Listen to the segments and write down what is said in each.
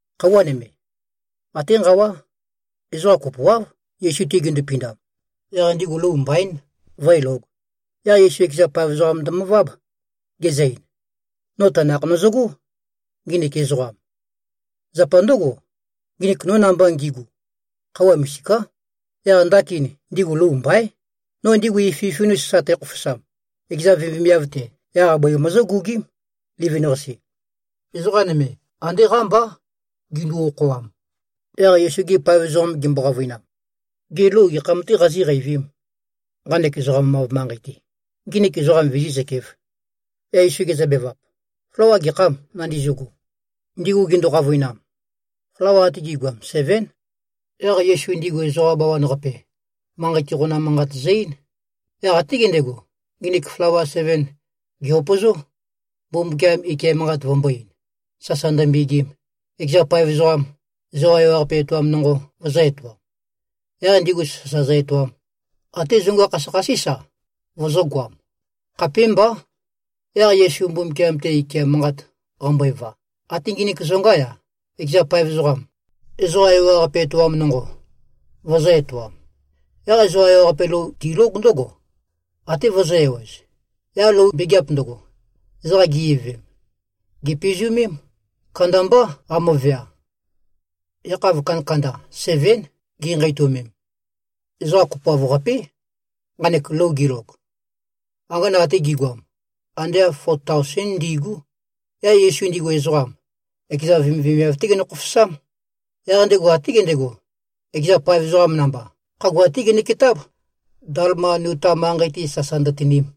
Khøuwa nøme, até nqawá, ezoqa kopoáv, Yesu-te gindupindam. Yaq ndigu lou mbaín, vǿelōg. Yaq Yesu ekeza paev ezoqam ndømøváb, gezø-ein, “No tanakh nøzøgó, nginik ezoqam. Zapa ndǿgo, nginik no namba ngigu, khøuwa misiká. Yaq ndakin, ndigu lou mbaín. No ndigu ififin-us sa tækhofosam, ekeza vemivemiav-te, yaq bøi møzǿgugím, livin-qase. Ezoqa nøme, andé qámbá gindu-okhoam.” Yaq Yesu-gi paev ezoqam gimbo-qavøinam, “Gê, lou gekham-tē qazíqeivīm, nqanek ezoqam-av manqei-te, nginik ezoqam vizí꞉zøkēf.” Yaq Yesu gezøbevap, “Flawa gekhâm nandizøgo?” Ndigu gindu-qavøinam, “Flawa ate gi꞉goam sevén.” Yaq Yesu ndigu ezoqa bawan-qape, manqei-te qonam manqat zø-eín. Yaq até gendego, nginik flawa seven gè-upøzó, Mbumbukiam ike manqat vømbō-ein, sasa ndømbegim, ekeza paev ezoqam, ezoqa ewaqape etoam nonqo, vøzø̄-etoam, yaq ndigu sasa zø-etoam. Até zonga khasøkhasís-a, vøzø̄goam. Khapémbá. Yaq Yesu Mbumbukiam-te ike manqat qambøeva, até nginik zongá-ya, ekeza paev ezoqam, ezoqa ewaqape etoam nonqo, vøzø̄-etoam. Yaq ezoqa ewaqape lou tilóg ndǿgo, até vøzø̄-ewez. Yaq lou mbegeap ndøgo, ezoqa gi-ivøvem, gèpizumém. Kandambá qamøvea. Yakhav kandakanda sevén, ginqeitømem. Ezoqa kopoav-qapé, nqanek lou gilog. Angana ate gi꞉goam, ande āv fo taosén ndi꞉gú. Yaq Yesu ndigu ezoqam, ekeza vemivemiav-té genø-khofosám. Yaq ndego até gendego, ekeza paev ezoqam namba, khagua-té ginøketáb, Dalmanuta manqei-te sasa ndøtinim.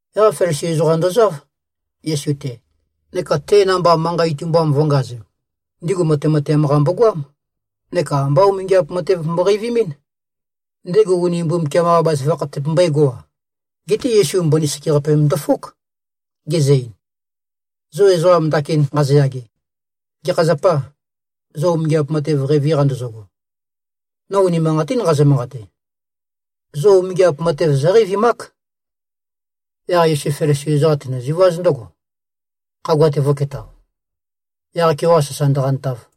Yaq Felisi ezoqam ndozáv, Yesu-te, neka te namba manqa itumbam vø̄ngazem. Ndigu matemateam-qa mbogoám. Neka ambá umingiap matev mboqeivimín, ndego uni Mbumbukiam-qa bazaføgakh tøpømbøégo-a. Geté Yesu mbøni sekeqape ndøfók, gezø-ein, “Zo ezoqa ndakin nqazoyage, gekha zapâ, zo umingiap matev qeivi-qa ndøzøgo? No unimanqatín nqazø-manqate, zo umingiap matev zóqeivimák.” Yaq Yesu Felisi ezoqam tenøziváz ndǿgo, khagua-te vø̄ketao, yaq-keoqa sasa ndøqantav.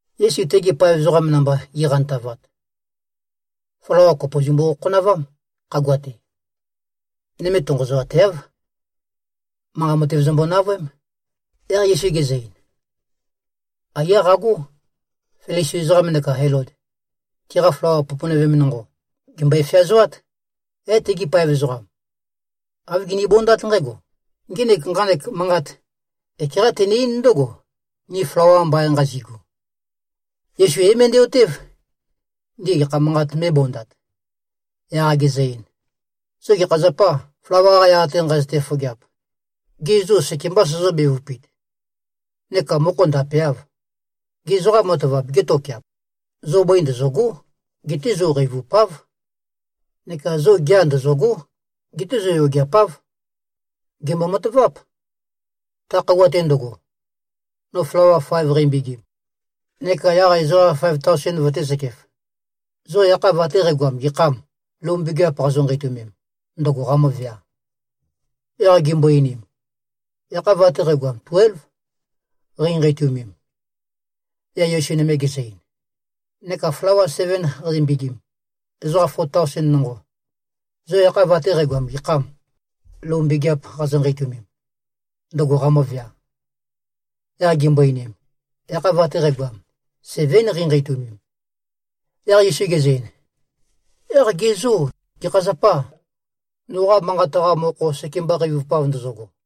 Yesu tegi paev ezoqam namba gi꞉qantavat, flawa kopo zømbu-khokhonavám, khagua-te. Nøme tonqozoateáv. Manqa matev zømbo-navøém. Yaq Yesu gezø-ein, “Aiyá qagó. Felisi ezoqam neka Elod, tiqa flawa poponøvem nonqo, gèmbøe-feazoát.” Yaq tegi paev ezoqam, āv ginibondát nqǽgo, “Ngenek nqanek manqat ekeqá tene-eín ndǿgo, ni flawa mbain nqazigu.” Yesu é-møndæ-otév, ndigu gekha manqat mē꞉bondat. Yaq gezø-ein, “Zo gekha zapâ, flawa-qa yaq-te nqazøte-fofogeap? Gê, zo sekemba sozó-bevupit, neka mokho ndapeâv? Gê, zoqa matavap gétokeap? Zo bøi ndøzø̂gó. Geté zo qeivupáv. Neka zo gea ndøzø̂gó. Geté zo yogeapáv. Gèmbo-mataváp, ta khøuwa-te ndøgo, no flawa faev qæmbegim, neka yaq ezoqa faev taosen vøtēzøkef. Zo yakhav ate qægoam gekhâm, lou mbegeap qazo-nqeitømem, ndøgo qamøvea?” Yaq gimbo-einim, “Yakhav ate qægoam tuélv, qeinqeitumem.” Yaq Yesu nøme gezø-ein, “Neka flawa seven qæmbegim, ezoqa fo taosen nonqo. Zo yakhav ate qægoam gekhâm, lou mbegeap qazo-nqeitømem, ndøgo qamøvea?” Yaq gimbo-einim, “Yakhav ate qægoam, sevén qeinqeitumem.” Yaq Yesu gezø-ein, “Yaq ge zô, gekha zapâ, noqa manqat-qa mokho sekemba qeivupav ndozogo?”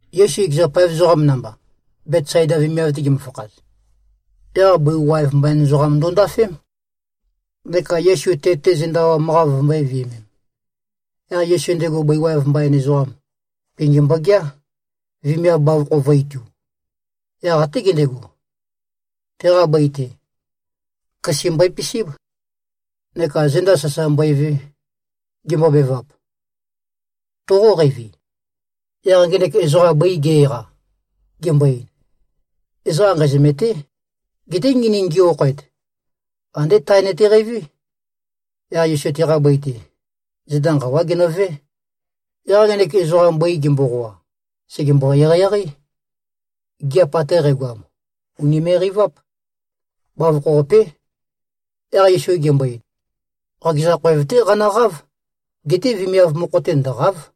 Yesu ekeza paev ezoqam namba, Betsaida vemiav-te gimøfakhaz, yaq bøi waev mbain ezoqam ndondafém, neka Yesu te-te zenda awam-qa vømbō-viømem. Yaq Yesu ndego bøi waev mbain ezoqam pingi mbogeá, vemiav bavokho vø̄-itu. Yaq até gendego, teqa bøi-te, køse mbøe-pisíb, neka zenda sasa mbøeve, gembobevap, “Toqóqeivi?” Yaq ngenek ezoqam bøi ge-eqa, gembo-ein, “Ezoqam nqæzømêté. Geté nginik ngi-okhoet, andé tae nøteqeiví.” Yaq Yesu teqa bøi-te, zenda nqawá genøvé. Yaq ngenek ezoqam bøi gemboqoa, sègembo-eqeieqeí. Gigiap ate qægoam ùnime꞉-qeiváp. Bavokho-qapé. Yaq Yesu gembo-ein, “Qakeza khoev-té qanøqáv. Geté vemiav mokho-te ndø̀qa᷄v.”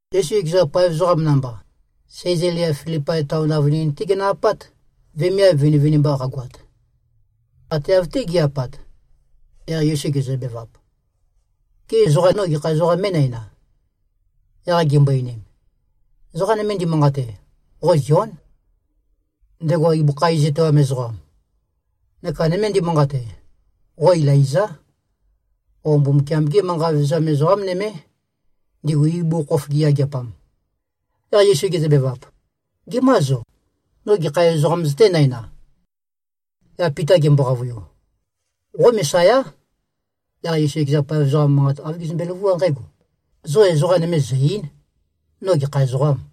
Yesu ekeza paev ezoqam namba, Sæzalia-Filipai taon avønin-té ginø-apát, vemiav vinivinimba qagoat. Ate av-té gi꞉-apat, yaq Yesu gezøbevap, “Gê, ezoqa no gekha ezoqām mé꞉næna?” Yaq gimbo-einim, “Ezoqa nøme ndimanqate, qo Zión, ndego ibøkha iz etoam ezoqam. Neka nøme ndimanqate, qo Ilaizá, o Mbumbukiam-gé manqa vevezam ezoqá nømé, ndigu ibugukhokhof giyageapam.” Yaq Yesu gezøbevap, “Gemâ zo? No gekha ezoqām zøténæna?” Yaq Pita gembo-qavøiu, “Qo Mesayá.” Yaq Yesu ekeza paev ezoqam manqa āv gezømbe-løvuá nqǽgo, “Zo ezoqa nøme zø̀-ei᷄n, no gekha ezoqām.”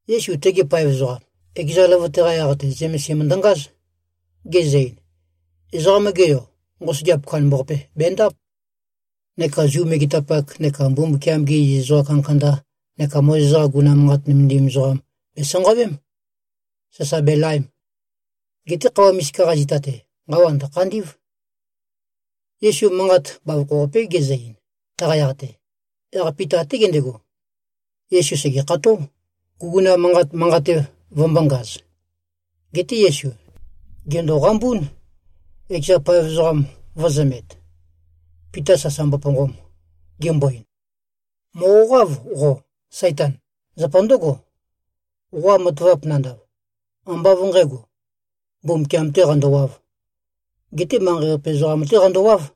Yesu tegi paev ezoqam, ekeza løvøte-qa yaq-te zømesim ndøngáz. Gezø-ein, “Ezoqam-ge Yo, nqosøgeap kandambaqape bendáp. Neka Zu megetapak neka Mbumbukiam-gi iziz ezoqa kandakanda neka Mozes-qa guguna manqat nømendim ezoqam bèsanqawém, sasa belaem. Geté khøuwa misika-qa zita-te, nqawa ndø̀khandí꞉v.” Yesu manqat bavokho-qapé gezø-ein, taqa yaq-te. Yaq Pita até gendego, Yesu sègekható, guguna manqat manqate vømbōngaz. Geté Yesu, gèndoqambún, ekeza paev ezoqam vø̄zømet, Pita sasa mboponqom, gembo-ein, “Mòqoqáv qo, Saitan! Zapa ndǿgo, qoqa matavap nandav, ambá av nqǣgo, Mbumbukiam-tē qandowāv. Geté manqei-qape ezoqam-té qandowāv.”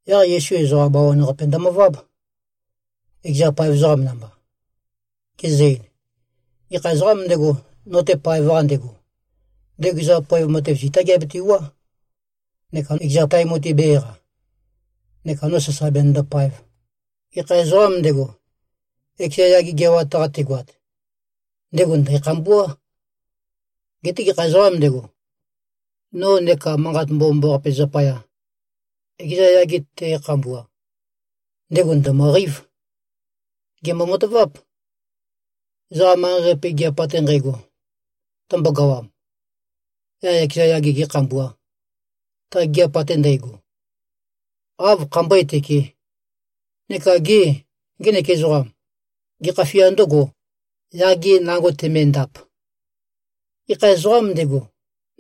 Yaq Yesu ezoqa bawan-qape ndømøváb, ekeza paev ezoqam namba, gezø-ein, “Gekha ezoqām ndego, no-te paev-qa ndego, ndego ekeza poev matev, zitá geabetewuá, neka ekeza tae mutui bē-eqa, neka no sasa benøndopaev. Gekha ezoqām ndego, ekeza yage geawat-qa tegoat, ndego ndæ̀khambuá. Geté gekha ezoqām ndego, no neka Manqat Mbomambaqape zapaya, ekeza yage te꞉khambua, ndego ndø̀møqeív. Gèmbo-mataváp. Ezoqa manqei-qape gigiap ate nqægo tømbogawam, yaq ekeza yage gēkhambuā, ta gigiap ate ndægo, áv khambøé-tøkē? Neka gê, ngenek ezoqam, gekha fia ndǿgō, yage nango temendap? Gekha ezoqām ndego,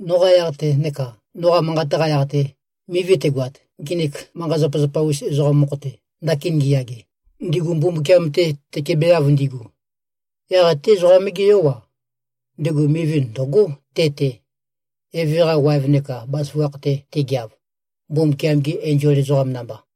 noqa yaq-te neka noqa manqat-qa yaq-te, mivi tegoat, nginik manqa-zapazapa-us ezoqam mokho-te, ndakin ngiyage, ndigu Mbumbukiam-te tøkebeav ndigu, yaq até Ezoqam-gé Yó-a, ndego mivi ndø̀gó te-te, Eve-qa waev neka bazaføgakh-te tegeav, Mbumbukiam-gi enzol ezoqam namba.”